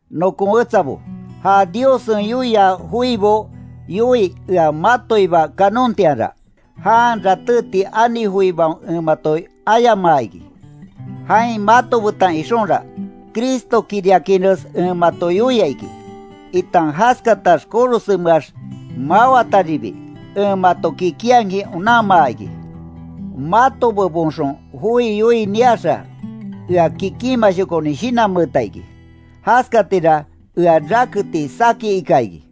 Nokon wetsabo, ja Diossen yoia joibo yoii ea matoiba kanontianra, jan ratéti ani joibaon en mato ayamaa iki. Jain mato betan ixonra, Cristokiriakinres en mato yoia iki, itan jaskatax korosenmeax mawataribi, en mato kikinhakin onanmaa iki. Mato bebonxon joi yoii niaxa, ea kikinmashokonin shinanmeeta iki, jaskatira ea raketi saki ika iki.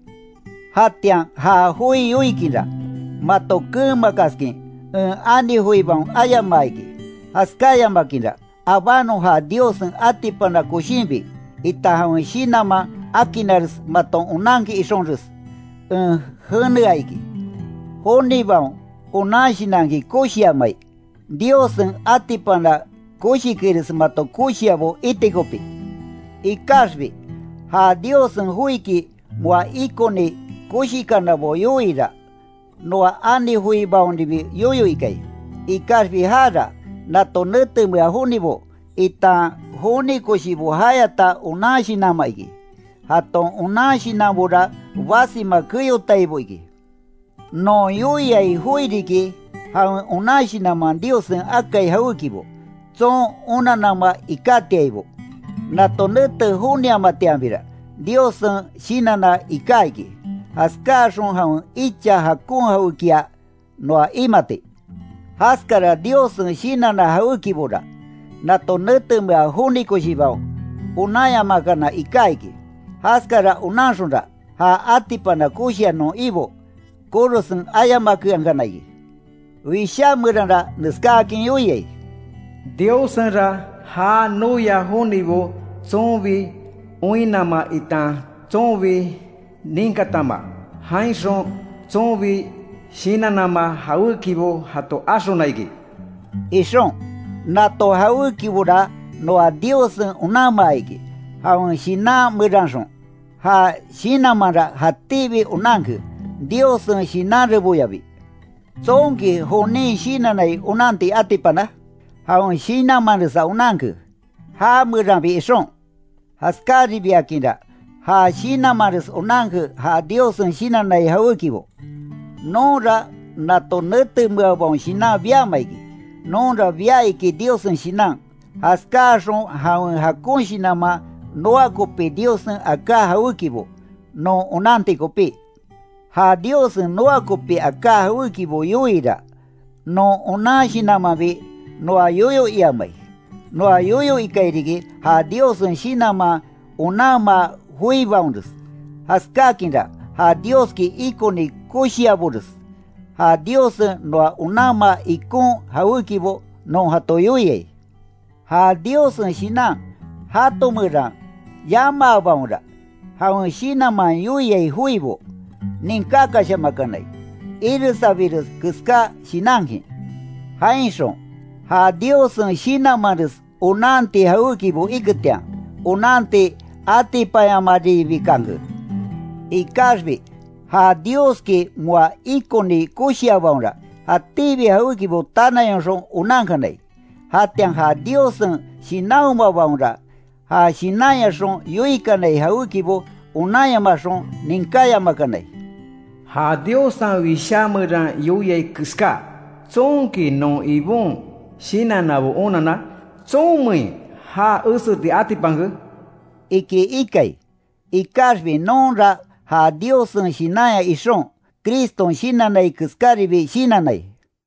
Jatian ja joi yoikinra, mato keenmakaskin en ani joibaon ayamaa iki. Jaskáyamakinra, abanon ja Diossen atipana koshinbi, itan jawen Shinanman akinnares maton onankin ixonres, en jenea iki. Jonibaon onan shinanki koshiamai, Diossen atipana koshikires mato koshiabo iti kopí. Ikaxbi, ja Diossen joiki moa ikoni koshikanabo yoiira, noa ani joibaonribi yoyo ikai. Ikaxbi jara, nato netemea jonibo, itan joni koshibo jayata onan shinanma iki, jaton onan shinanbora basima keyotaibo iki. Non yoiai joi riki, jawen onan shinanman Diossen akai jawékibo, tson onanama ikátiaibo. Nato nete joniamatianbira, Diossen shinanna iká iki, jaskáaxon jawen icha jakon jawékia noa imati. Jaskara Diossen shinanna jawékibora, nato netemea joni koshibaon onanyamakana iká iki, jaskara onanxonra, ja atipana koshia non Ibo, korosen ayamakeankana iki. Wishá meranra neskáakin yoiai: “Diossenra, já noia jonibo, tsonbi oinnama itan tsonbi ninkatama, jainxon tsonbi shinannama jawékibo jato axona iki” ixon. Nato jawékibora noa Diossen onanmaa iki, jawen Shinan meranxon. Ja Shinanmanra jatíbi onanke, Diossen shinan reboyabi. ¿Tsonki jonin shinannai onanti atipana? Jawen shinanmanresa onanke, ja meranbi ixon. Jaskaribiakinra ja Shinanmanres onanke ja Diossen shinannai jawékibo. Nonra nato netemeabaon shinan biama iki. Nonra bia iki Diossen Shinan, jaskáaxon jawen jakon shinanman noa kopi Diossen aká jawékibo, non onanti kopí. Ja Diossen noa kopi aká jawékibo yoiira, non onan shinanmanbi noa yoyo iamai. Noa yoyo ikai riki, ja Diossen Shinanman onanmaa joibaonres. Jaskákinra ja Dioski ikoni koshiabores, ja Diossen noa onanmaa ikon jawékibo non jato yoiai. Ja Diossen Shinan jato meran yamaabaonra, jawen Shinanman yoiai joibo, ninkákashamakanai, iresabires keská shinankin. Jainxon ja Diossen Shinanmanres onanti jawékibo iketian, onanti atipanyamaribikanke. Ikaxbi ja Dioski moa ikoni koshiabaonra, jatíbi jawékibo tanayonxon onankanai, jatian ja Diossen Shinanhomabaonra ja Shinanyaxon yoikanai jawékibo onanyamaxon ninkáyamakanai, Ja Diossen Wishá meran yoiai keská: ¿Tsonki non Ibon Shinannabo onanna? ¿Tsonmein já eseti atipanke? iki ikai, ikaxbi nonra ja Diossen Shinanya ixon, Criston shinannai keskáribi shinannai.